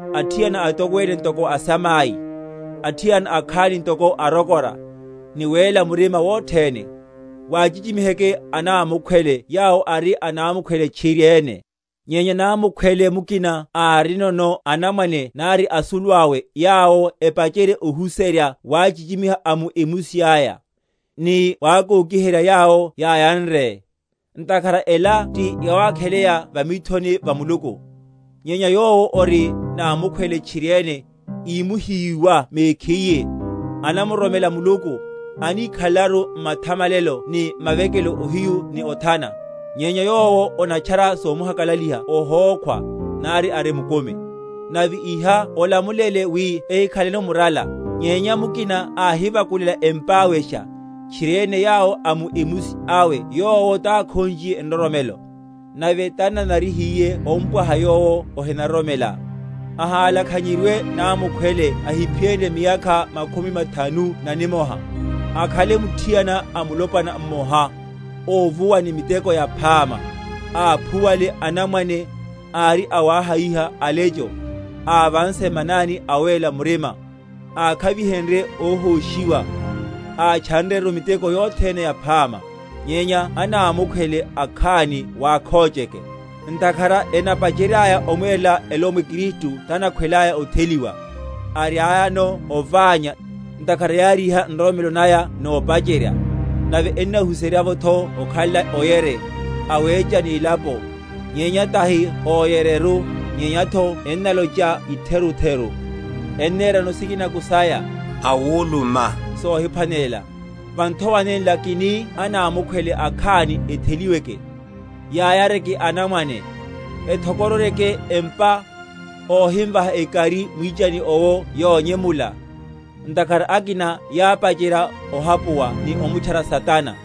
athiana atokwene ntoko asamai; athiana akhani ntoko arokora, ni wéla murima wothene. Wachichimiheke anámukhwele yawo ari anámukhwele tchiriene. Nyenya námukhwele mukina árinono anamwane nari asuluawe yawo epacherye ohuserya wachichimiha a mu emusi aya, ni wakokiherya yawo yáyanre; ntakhara ela ti yawakheleya va mithoni va Muluku. Nyenya yowo ori námukhwele tchiriene, ímuhiyiwa mekhiye, anamuroromela Muluku, anikhalelaru m’mathamalelo ni m’mawekelo ohiyu ni othana. Nyenya yowo onatchara somuhakalaliha ohókhwa, nari ari mukumi. Nave iha olamulele, wi ehikhaleno murala. Nyenya mukina áhivakulelaka empáwesha, tchiriene yawo a mu emusi awe yowo takhonchiye nroromelo, nave tanananariye ompwaha yowo ohinaroromela. Ahalakhanyeryiwe námukhwele ahiphiyenrye miyakha makhumi mathanu na nimoha, akhanle muthiana a mulopwana mmoha, óvuwa ni miteko yaphama; áphuwale anamwane, ári awahayiha alecho, ávanse manani a awéla murima, ákhavihenrye óhóshiwa, átchanreru miteko yothene yaphama. Nyenya anámukhwele akhani wakhocheke; ntakhara enapacheryaya omwerela elomwe Kristu tanakhwelaya otheliwa; ariayano oványa, ntakhara yáriha nroromelo naya nopacherya. Nave ennahuserya’votho okhala oyere, awecha nílapo; nyenya tahi oyereru, nyenyatho ennalocha itherutheru, enerano sikinako saya, awuluma sohiphwanelela. Va nthowa nenla kini anámukhwele akhani etheliweke, yayareke anamwane, ethokororyeke empa, óhimvaha ekari mwichani owo yonyemula; ntakhara akina yápacherya ohapuwa ni omutchara Satana.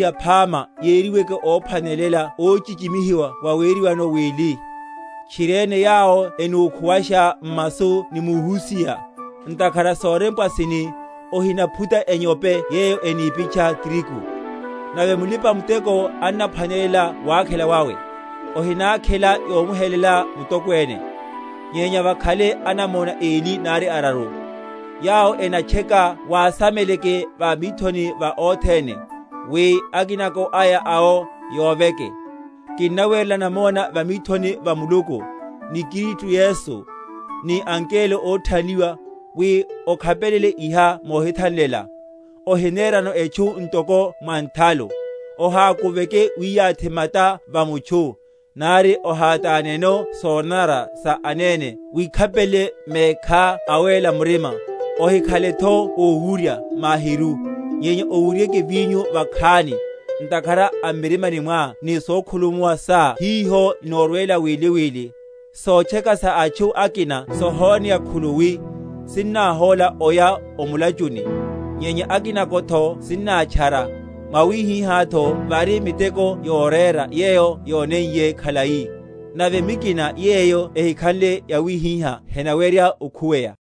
Atokwene óthoriha phama yeriweke óphwanelela óchichimihiwa waweriwano wili, tchiriene yawo enúkhuwasha m’masu ni muhusiha. Ntakhara sorempwa sini, Ohinaphuta enyope yeyo enipitcha trigu. Nave, Mulipa‐muteko annaphwanela wakhela wawe. Ohinákhela yomuhelela mutokwene, nyenya vakhale anamona eli nari araru. Yawo enatcheka wasameleke va mithoni va othene, wi akinako aya awo yoveke. Kinnawerela namona va mithoni va Muluku, ni Kristu Yesu, ni angelo óthanliwa, wi okhapelele iha mohithanlela, ohinerano etchu ntoko mwa nthalu. Ohákuveke wiyathi mata va mutchu, nari ohátáneno sonanara sa anene; wikhapelele mekhá awéla murima. Ohikhaletho owurya mahiru, nyenya owuryeke vinyo vakhani, ntakhara a m’mirimani mwá ni sokhulumuwa sa hiho inorwela wili wili. Sotcheka sa atchu akina sohoneya khuluwi, sinnahóla oya o mulachuni; nyenya akinatho sinnátchara. Mwawihihátho vari miteko yorera yeyo yóneiye khalai; nave mikina yeyo ehikhanle yawihiha henawerya okhuweya.